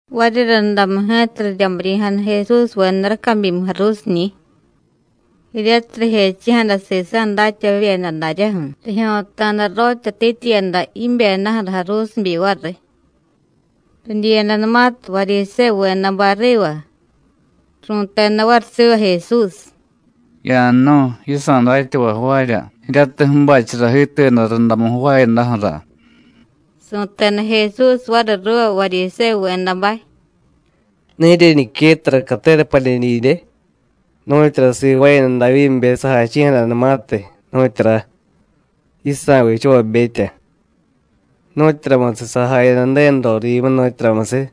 Variryundamu ji̱ta riryamiryi̱jada Jesúsveda racabyimu jaruusiñi̱. Jiryatiy rijechi̱jada sisa̱ datyavavyeda daryaju̱, rijyo̱ta̱da rotyatityiyada jibyedaju̱ra jaruusibyi variy. Ridyiyadanumatiy Varyisévuvedabay riva, ru̱teda variy siva Jesús: “Ya̱jnu̱y, yisa̱ datyavay jvaarya jiryatiy ju̱bachara jiituyada rundamu jvaayadaju̱ra.” Su̱teda Jesús variy ruuva Varyisévuvedabay: “¿Ne jiryeñiquettara catera padye didye, nu̱tyura sivaayada Davyíbe sajachi̱jadanumatiy, nu̱tyura? yisa̱ vichavabetya. Nu̱tyuramusiy sajayada Ju̱denu rorivyimu, nu̱tyuramusiy,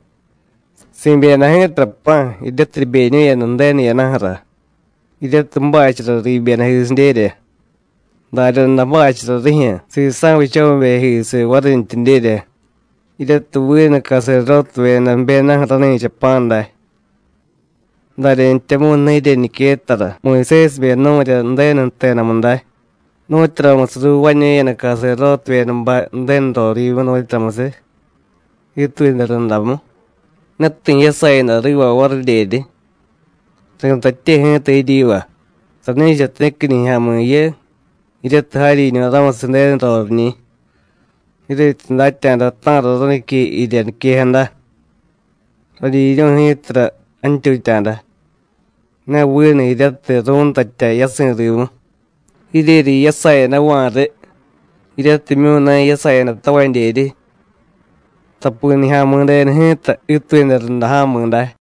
si̱byeda ji̱tara pa̱, jiryatiy ribeñu̱yada Ju̱denu jiyadaju̱ra, jiryatiy ju̱bachara riibyedajisidyerya, daryaday ju̱bachara rijyu̱ sisa̱ vichavabejisiy varintyidyerya, jiryatiy vinu caserdótevyeda jbyedaju̱ rani̱cha pa̱ day. ¿Daryantyamu̱y ne jiryeñiquettara Muyusésibe nu̱rya Ju̱denu jtedamu day, nu̱tyuramusiy ruuvaañu̱yada caserdótevyedabay Ju̱denu rorivyimu, nu̱tyuramusiy, jiituyada rundamu? Ne ti̱ jiyasayada riva varidyeryi. Ri̱tatye ji̱ta jiryiva: Sani̱cha ti̱qui nijya̱mi̱ jiyu, jiryatiy jaryiñu̱ ramusiy Ju̱denu roriñi̱. Jiryetyi datya̱da ta̱ra ránique jirya niquejada: Radyiryu̱y ji̱tara jantyutya̱da, ne vinu jiryatiy ru̱ntatya yasi̱ rimu, jiryeryi jiyasayadava̱ riy jiryatimyu̱ ne jiyasayadatavadyeryi. Tapi Nijya̱mi̱denu ji̱ta jiituyada runda ja̱mi̱ day.”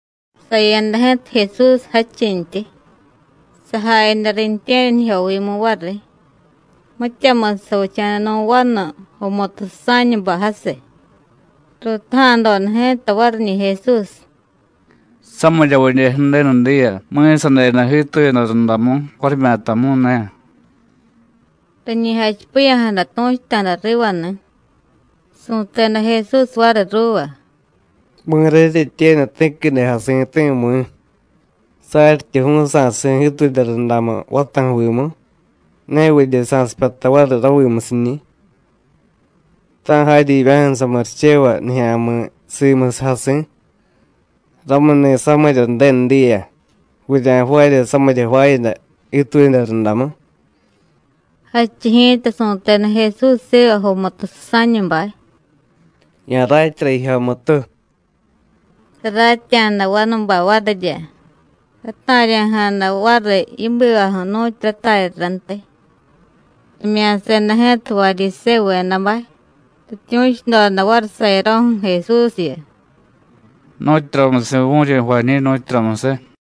Saya̱da ji̱ta Jesús jadchintyi, sajayada riintye̱ryanijyovimu variy. Mityamusiy savicha̱da nu̱ vanu jomutu susa̱ñubay jasiy. Ruutaja̱doda ji̱ta variñi̱ Jesús: “¿Samiryavidye Ju̱denu diya mi̱sadeda jiituyada rundamu, varimyatamu̱y ne?” Riñi jachipiya̱jada tu̱chuta̱da rivani̱. Su̱teda Jesús variy ruuva: “¿Mi̱ra jiryetyenu, ti̱quide jasi̱ti̱, mi̱, saryityi ju̱u̱y sa̱si̱ jiituyada rundamu vataju̱vimu, nevidye sa̱sipyata variy ravimusiñi̱? ¡Ta̱ jaryivya̱ju̱ samurichevay nijya̱mi̱ simusiy jasi̱! Ramuni̱ samirya Ju̱denu diya vurya̱jvaarya samirya jvaayada jiituyada rundamu.” Jadchiy ji̱ta su̱teda Jesús siva jomutu susa̱ñubay: “Ya̱ratyara jijyomutu.” Saratya̱da vanubay varirya, rata̱rya̱jada variy yibivaju̱ nu̱tyu rataryarantiy. Rimya̱seda ji̱ta Varyisévuvedabay, rityu̱chudoda variy sayaro̱ju̱ Jesúsyu: “¿Nu̱tyuramusiy vu̱ryi jvañi̱, nu̱tyuramusiy?”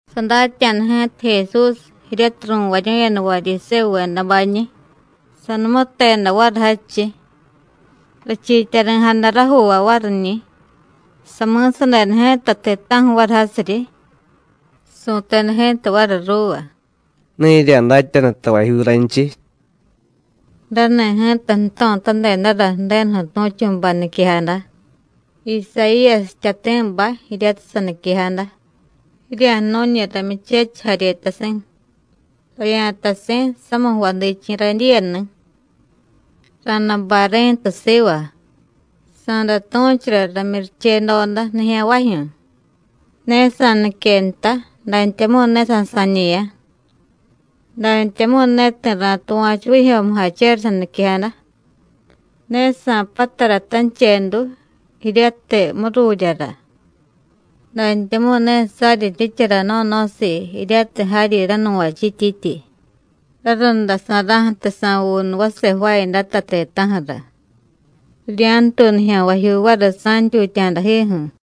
Sadatya̱da ji̱ta Jesús jiryatiy ru̱varyu̱yada Varyisévuvedabañi̱, sanumuteda variy jadchiy. Richiityari̱jada rajuuvay variñi̱, sami̱sadeda ji̱ta ti̱ta̱ju̱ variy jasiryi. Su̱teda ji̱ta variy ruuva: “Ne jirya̱datyanu tavajyu̱ raynchiy.” Rani̱ ji̱ta jto̱tadedara Ju̱denuju̱ tu̱chu̱bay niquejada, Isayíyasiy jtyati̱bay, jiryatiy saniquejada: “Jirya̱jnu̱ñi̱ ramyuchechiy jaryetasi̱, ravya̱tasi̱ samiy jvadichi̱ radyiyani̱. Ra̱day bay ri̱ntu siva, sa̱day tu̱chura ramyurichedoda nijya̱nvajyu̱. Ne sa̱nique nta, dantyamu̱y ne sa̱sa̱ñe̱ya̱, dantyamu̱y ne ti̱ ra̱tuva̱chu vijyo̱mujachera saniquejada. Ne sa̱patara tanchedu jiryatiy mururyara, dantyamu̱y ne saryi jiryichara no̱no̱siiy jiryatiy jaryi ránuvachíityityi, rarundasa̱ra̱ju̱tiy sa̱vuunu vase jvaayadata ti̱ta̱ju̱ra. Rirya̱ntuy nijya̱nvajyuu variy sa̱ntyutya̱dajiju̱.”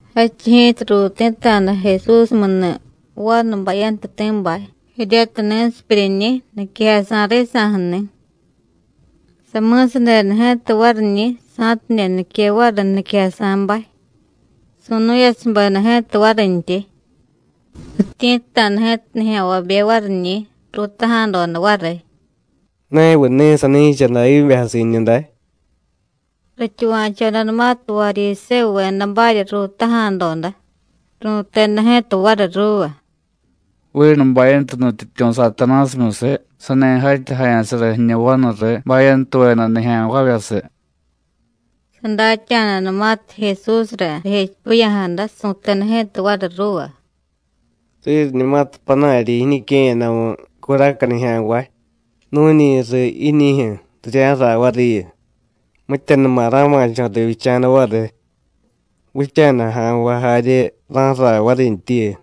Jadchiy ji̱ta ruuti̱ta̱da Jesúsmuju̱ni̱ vanu bayantuti̱bay jiryatiy ni̱sipyuryiñi̱, niquejasa̱ risa̱ju̱ni̱. Sami̱sadeda ji̱ta variñi̱ sa̱tidye nique variy niquejasa̱bay, su̱nu̱yasubeda ji̱ta varintyi. Rityi̱tta̱da ji̱ta nijya̱nvabe variñi̱, ruutaja̱doda variy: “¿Neviy ni̱ sani̱cha Davyíbe jasi̱ jiñu day?” Rityuva̱chodanumatiy Varyisévuvedabarya ruutaja̱doda, ru̱teda ji̱ta variy ruuva: “Vinu bayantu nutyityu̱ Satanásimyusiy sani jatyajaya̱sara jiñu vanuriy bayantuveda nijya̱nvavyasiy.” Sadatya̱danumatiy Jesúsra rijechipiya̱jada, su̱teda ji̱ta variy ruuva: “Riryiñumatiy panaryi̱ jiñique̱yadamu curaca nijya̱nvay nu̱ñi riy jiñijyu̱, rirya̱raay variyu, mityanuma ra̱ma̱cho̱ rivyicha̱da variy; vicha̱daja̱nvay jarye ra̱ju̱raay varintyiyu.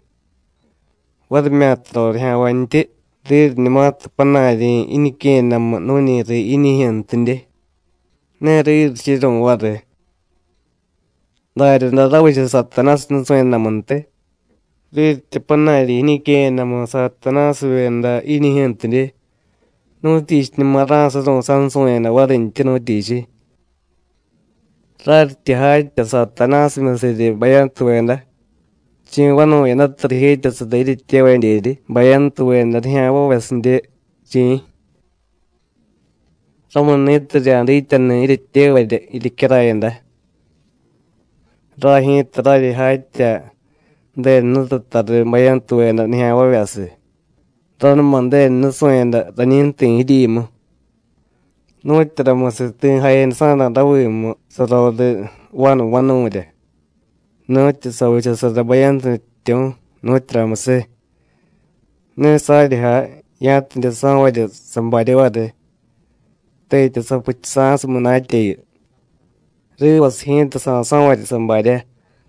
Varimyata rorijya̱nvantyi, riryiñumatiy panaryi̱ jiñique̱yadamu nu̱ñi riy jiñijyu̱ntidye, ne riryichuru̱y variy. Daryaday ravicha Satanásiy nusu̱yadamuntiy; riryityi panaryi̱ jiñique̱yadamu Satanásivyeda jiñijyu̱ntidye, ¿nu̱tyichiñuma ra̱suru̱y sansu̱yada varintyi, nu̱tyichiy? Raryityi jatya Satanásimyusiryi bayantuveda, ¿chi̱ vanu̱yadata rijetyasara jiryetyevadyeryi bayantuveda nijya̱nvavyasidye, chi̱? Ramuni̱tiy rirya̱dityanu jiryetyevarya jiryecyarayada. Ray ji̱ta raryi jatya Ju̱denu Jnututa riy bayantuveda nijya̱nvavyasiy, ranuma Ju̱denu nusu̱yada rañi jti̱ jiryimu. ¿Nu̱tyuramusiy ti̱ jayadasa̱ra̱ ravimu saroriy vanu vanu̱rya nu̱tyu savichasara bayantu nutyityu̱, nu̱tyuramusiy? Ne saryi jay ya̱tidye so̱varya sabarya variy, tetya sapuchusa̱siy munatyayu. Rivasiy ji̱ta sa̱so̱varya sabarya.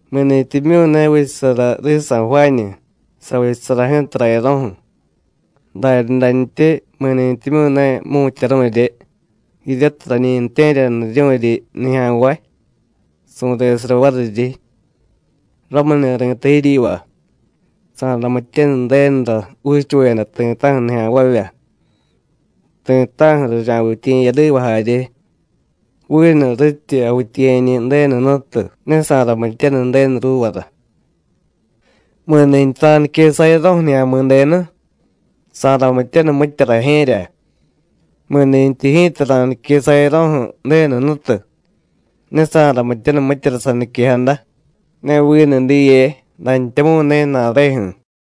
Mi̱ni̱tyimyu̱ ne vichasara risa̱ jvaañu, savichasara ji̱ta rayaro̱ju̱; daryadantyi mi̱nintyimyu̱ ne jmu̱tyaru̱rye, jiryatiy rañi ju̱tye̱ryaniryu̱ryi nijya̱nvay, su̱resara variryi. Ramuni̱ ri̱tay jiryiva: Sa̱ramityaniy Ju̱denura juuchuveda ti̱ta̱ju̱ nijya̱nvavya, ti̱ta̱ju̱ rirya̱vityiye̱yadiva jarye; vinu rityi javityiye̱ñi̱ Ju̱denu Jnutu, ne sa̱ramityaniy Ju̱denu ruuvara. Mi̱ni̱tyi ra̱nique sayaro̱ju̱ Nijya̱mi̱denu, sa̱ramityaniy mitya rajye̱rya. Mi̱nintyi ji̱ta ra̱nique sayaro̱ju̱ Ju̱denu Jnutu, ne sa̱ramityaniy mityara saniquejada, ne vinu diye, dantyamu̱y ne ju̱na̱reju̱.”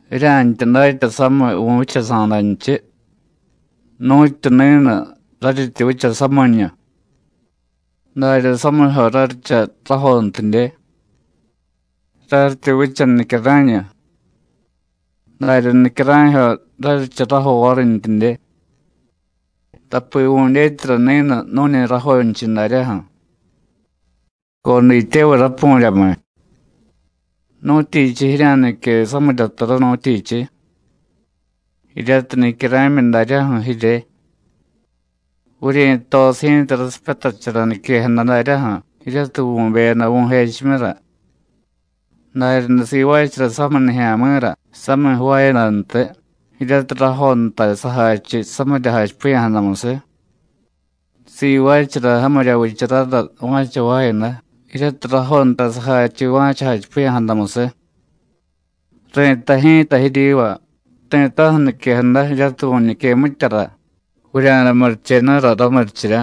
“Jirya̱ntya datya samiy vu̱vyichasa̱danchiy, nu̱tyu ni̱nu, raryityi vicha samiñu, darya samijyo raryicha rajontidye; raryityi vicha nicyara̱ñu, darya nicyara̱jyo raryicha rajo varintyidye. Tapi vu̱dyetyara ni̱nu nu̱ñi rajonchiy daryaju̱. ¡Codityevay rapu̱ryamiy! ¿Nu̱tyichiy jirya̱nique samirya tara, nu̱tyichiy? jiryatiy nicyara̱myi daryaju̱ jirye. Vuryi̱tosiy ji̱ta rasipyatachara niquejada daryaju̱, jiryatiy vu̱beyada vu̱jechimyura. Daryaday sivaachara samiy nijya̱mi̱ra samiy jvaayadantiy, jiryatiy rajontay sajachiy samirya jachipiya̱jadamusiy. Sivaachara jamirya vicharara va̱cha jvaayada, jiryatiy rajontay sajachiy va̱cha jachipiya̱jadamusiy. Ri̱tay ji̱ta jiryiva: Ti̱ta̱ju̱ niquejada jiryatiy vu̱ñique mityara, vurya̱day murichenura ramurichirya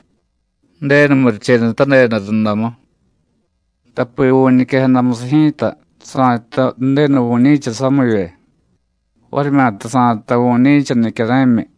Ju̱denu murichenutadeda rundamu. Tapi vu̱ñiquejadamusiy ji̱ta sa̱jtay Ju̱denu vu̱ñi̱cha samivye, varimyata sa̱jtay vu̱ñi̱cha nicyara̱myi.”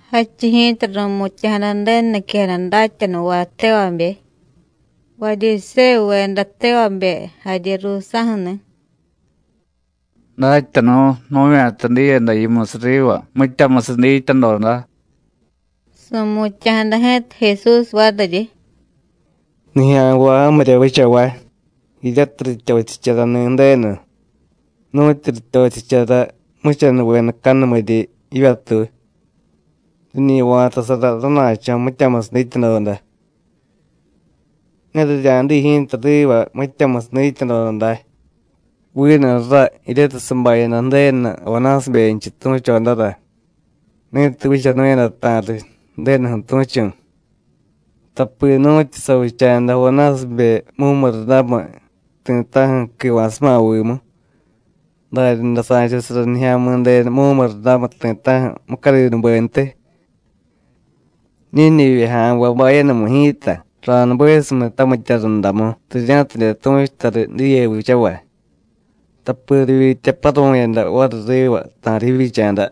Jadchiy ji̱ta ru̱mutya̱jada Ju̱denu niquejada datyanuvay tevabe, Varyisévuveda tevabe jarye ruusa̱ju̱ni̱: “Datyanu̱, nu̱vya̱ta diyada yimusiy riva mityamusiy dityadoda.” Su̱mutya̱jada ji̱ta Jesús variryi: “Nijya̱nvay jamirya vichavay, jiryatiy rityochicharani̱ Ju̱denu nu̱tyu rityochichara jmuchanuvedacanumiryi jivyatuy, riñi va̱tasara rana̱cho̱ mityamusiy dityadoda. Ne rirya̱diy ji̱ta riva mityamusiy dityadoda day, vinu ra jiryatiy sabayada Ju̱denu Jonásibenchiy tu̱chodara, ni̱tiy vichanu̱yada ta̱riy Ju̱denuju̱ tu̱chu̱. Tapi nu̱tyu savicha̱da Jonásibe mumurundamiy ti̱ta̱ju̱ quiva̱suma vimu, daryaday sa̱chasara Nijya̱midenu mumurundamiy ti̱ta̱ju̱ mucadinubentiy. Ñíñivye ja̱nvay bayanumiy ji̱ta ra̱nubesumiy tamitya rundamu, rirya̱tidye tu̱chuta riy diye vichavay, tapi rivyitya paru̱yada variy riva ta̱riy jivyicha̱da,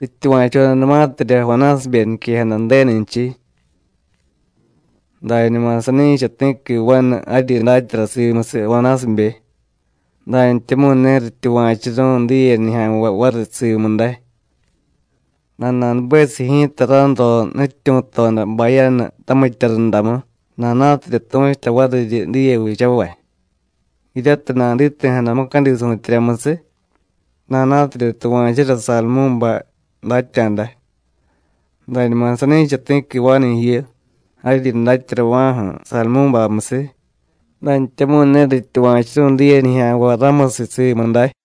rityuva̱chodanumatirya Jonásibe niquejada Ju̱denunchiy. Dañuma sani̱cha ti̱qui vanu jaryi datyara simusiy Jonásibe, dantyamu̱y ne rityuva̱churu̱y diye nijya̱nvay variy simu day. Nana̱nubesiy ji̱ta ranro nutyityu̱toda bayanu tamitya rundamu, nana̱tidye tu̱chuta variryi diye vichavay, jiryatiy naditi̱jada mucadi su̱tyeryamusiy, nana̱tidye tuva̱chura Sadumú̱bay datya̱da. Dañuma sani̱cha ti̱qui vanu jiyu, jaryi datyarava̱ju̱ Sadumú̱bamyusiy, dantyamu̱y ne rityuva̱churu̱y diye nijya̱nvay ramusiy simu day.”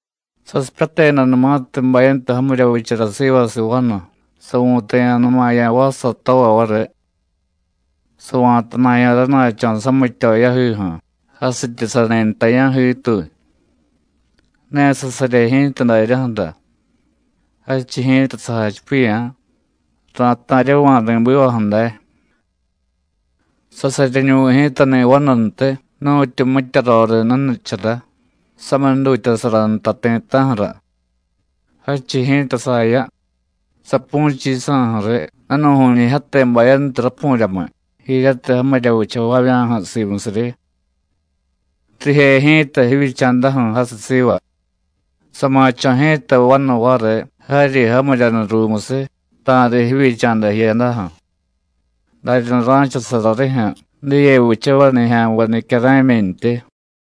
“Sasipyatedanumatiy bayantu jamirya vichara sivasiy vanu, savu̱taya̱numaya̱ vassatova variy, sava̱tana̱ya̱ rana̱cho̱ samityo yajiju̱ jasityi sani nta ya̱jiituy. Ne sasarye ji̱ta daryaju̱ra. Jadchiy ji̱ta sajachipiya̱: Ra̱ta̱ryava̱ ri̱bivaju̱ day. Sasaryenuvi̱ ji̱tani̱ vanuntiy, nu̱tyu mitya roriy nunichara, samiy jdutyasara nta ti̱ta̱ju̱ra. Jadchiy ji̱ta saya, sapu̱chiy yisa̱ju̱ riy danu̱ju̱ñijyate bayantu rapu̱ryamiy, jiryatiy jamirya vichavavya̱ju̱ simusiryi. Rije ji̱ta jivyicha̱daju̱ jasiy siva. Sa̱ma̱cho̱ ji̱ta vanu variy jaryi jamiryanu ruumusiy, ta̱riy jivyicha̱da jiyadaju̱. Daryaday ra̱chasara rijyu̱ diye vichavay nijya̱nvay nicyara̱myintyi.”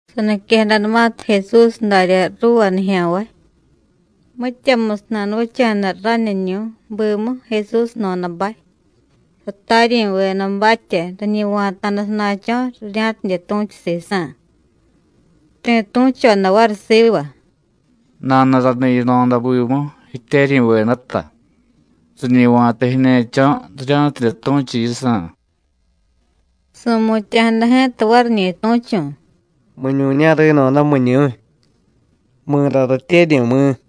Saniquejadanumatiy Jesús darya ruuva nijya̱nvay, mityamusiy nanuvicha̱da raniñu̱y bimu Jesús jno̱dabay, sataryi̱vedabatya, riñi va̱ta̱da sana̱cho̱, rirya̱tidye tu̱chu sisa̱. Ti̱ tu̱choda variy siva: “Nanuraniy yino̱da bimu, jityeryi̱vedata, riñi va̱ta jiñe̱cho̱ rirya̱tidye tu̱chu yisa̱.” Su̱mutya̱jada ji̱ta variñi̱ tu̱chu̱: “¿Miñu̱ña̱ ri̱no̱da, miñu̱y? ¿Mi̱ra ratyeryi̱, mi̱?”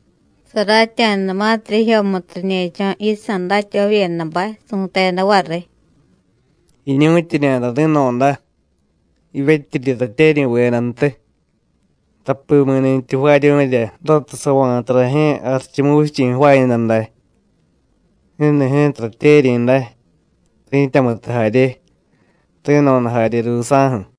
Saratya̱danumatirya jijyomutu riñe̱cho̱ yisa̱ datyavavyedabay, su̱teda variy: “Jiñu̱tyiñada ri̱no̱da, jivyetyiryi ratyeryi̱vedantiy. Tapi mi̱ni̱tyi jvaaryu̱rya ratiy sava̱ta rajye̱ Jarichumuvichi̱ jvaayada day, ni̱ni̱ ji̱ta ratyeryi̱ day, ri̱tyamutu jarye, ri̱no̱da jarye ruusa̱ju̱.”